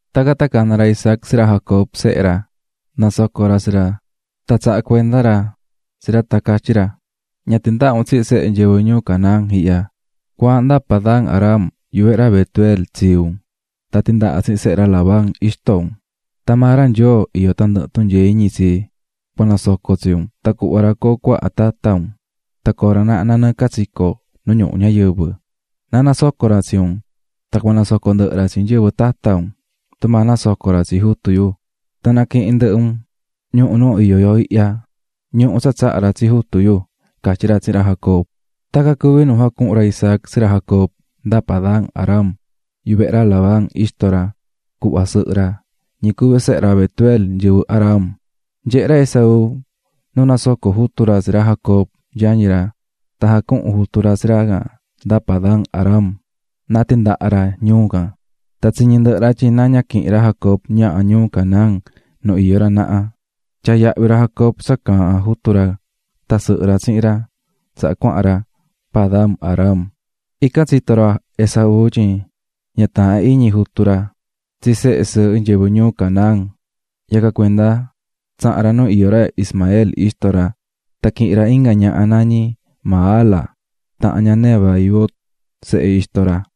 Tacan tan cana̱ ra Isaac tsi ra Jacob, sehe ra, nasoco̱ ra tsi ra tan tsaha̱ cuenda ra tsi ra tan catyí ra: "Ña tindaha un tsihin sehe nyɨvɨ ñuu Canaán ihya. Cua̱ahan nda Padan-aram yuvehe ra Betuel, tsii un, tan tindaha tsihin sehe ra Labán, ixto un. Tan maa ra Nyoo iyó tandɨhɨ tunyee iñi tsi, cua nasoco tsi un tan cuhva ra coo cuaha tata un tan coo ra naha nanɨɨ catsico nu ñuhu ñayɨvɨ. Na nasoco ra tsi un tan cua nasoco ndɨhɨ ra tsi nyɨvɨ tata un, tumaa nasoco̱ ra tsi jutu yu, tan naquihin ndɨhɨ un ñuhu nu iyó yo ihya, ñuhu tsa tsaha̱ ra tsi jutu yu", catyí ra tsihin ra Jacob. Tacan cuví nu jacuhu̱n ra Isaac tsi ra Jacob nda Padan-aram, yuvehe ra Labán, ixto ra, cuhva sɨhɨ ra, ñi cuví sehe ra Betuel, nyɨvɨ Aram. Nyehe̱ ra Esaú nu nasoco̱ jutu ra tsi ra Jacob, yañi ra, tan jacuhu̱n jutu ra tsi ra can nda Padan-aram na tindaha ra ñuu can. Tan tsiñi̱ ndɨhɨ ra tyin na ña quihin ra Jacob ñaha ñuu Canaán nu iyó ra naha. Tyaa̱ yahvi ra Jacob tsa caahán jutu ra tan sɨhɨ ra tsihin ra tsaha cuahan ra Padan-aram. Ican tsito̱ ra Esaú tyin ña taahán iñi jutu ra tsi sehe sɨɨhɨ nyɨvɨ ñuu Canaán; yacan cuenda tsaha̱n ra nu iyó ra Ismael, ixto ra, tan quihi̱n ra inga ñaha nañí Mahala, tahan ña Nebaiot, sehe ixto ra.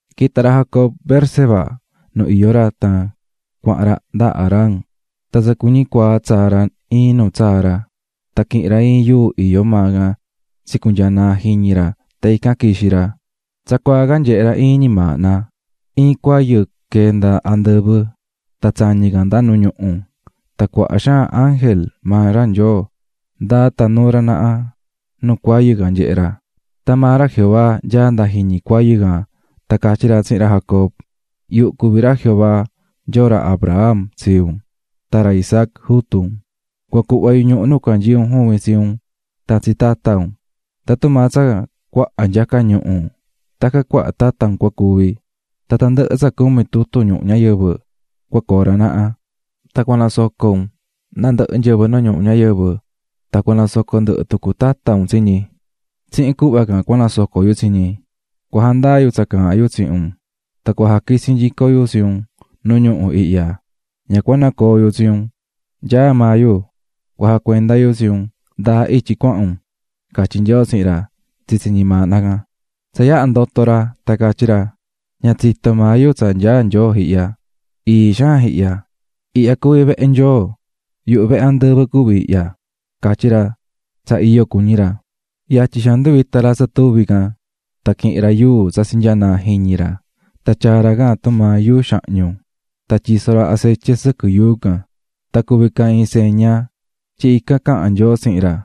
Quita̱ ra Jacob Beerseba nu iyó ra tan cuahan ra nda Harán. Tan tsa cuñí cuaa tsaa̱ ra iin nu tsaa̱ ra, tan quihi̱n ra iin yuu iyó maa can tsicunyaa̱ naa jiñi ra tan ican quixi̱ ra. Tsacuaa can nyehe̱ ra iin ñimaahna: Iin cuayɨ quee̱ nda andɨvɨ tan tsañí can nda nu ñuhu, tan cuaha xaan ángel maa ra Nyoo ndaá tan nuú ra naha nu cuayɨ can nyehé ra. Tan maa ra Jehová nyaá nda jiñi cuayɨ can tan catyí ra tsihin ra Jacob: "Yuhu cuví ra Jehová, Nyoo ra Abraham, tsii un, tan ra Isaac, jutu un. Cua cuhva yu ñuhu nu canyií un juvin tsi un tan tsi tata un. Tan tumaa tsa cuaha nyaca ñuhu tacan cuaha tata un cua cuvi, tan tandɨhɨ tsa cumi tutun ñuhu ñayɨvɨ cua coo ra naha; tan cua nasoco un nandɨhɨ nyɨvɨ nu ñuhu ñayɨvɨ, tan cua nasoco ndɨhɨ tucu tata un tsi ñi, tsihin cuhva can cua nasoco yu tsi ñi. Cua jandaa yu tsa caahán yu tsihin un tan cua jaquitsi nyico yu tsi un nu ñuhu ihya, ña cua nacoo yu tsi un, nyaá maa yu cua jacuenda yu tsi un ndaa ityi cuahan un", catyí Nyoo tsihin ra tsitsi ñimaahna can. Tsa yaha ndoto̱ ra tan catyí ra: "Ña tsitó maa yu tsa nyaá Nyoo ihya. Ii xaan ihya, ihya cuví vehe Nyoo, yuhu vehe andɨvɨ cuví ihya," catyí ra tsa iyo cuñí ra. Yatyi xaan nduvita̱ ra tsa tuvi can, tan quihi̱n ra yuu tsa tsinyaa̱ naa jiñi ra tan tyaa̱ ra can tumaa yuu xahñu tan tyiso̱ ra acetye sɨquɨ yuu can, tan cuví can iin tsa ndaa tyin ican caha̱n Nyoo tsihin ra.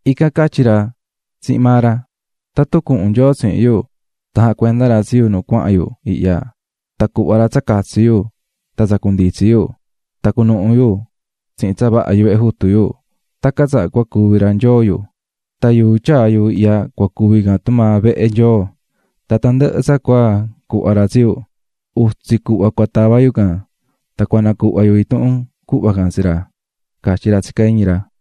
Ican catyí ra tsihin maa ra: "Tatun cuhun Nyoo tsihin yo tan jacuenda ra tsi yo nu cuahan yo ihya, tan cuhva ra tsa catsi yo tan tsa cunditsi yo, tan quitsi nuhu nyico yo tsihin tsa vaha yuvehe jutu yo, cua cuvi ra Nyoo yo. Tan yuu tyaa̱ yo ihya cua cuvi can tumaa vehe Nyoo; tan tandɨhɨ tsa cua cuhva ra tsi yo, utsi cuhva cua tava yo can tan cua nacuhva yo intuhun cuhva can tsi ra", catyí ra tsihin ra.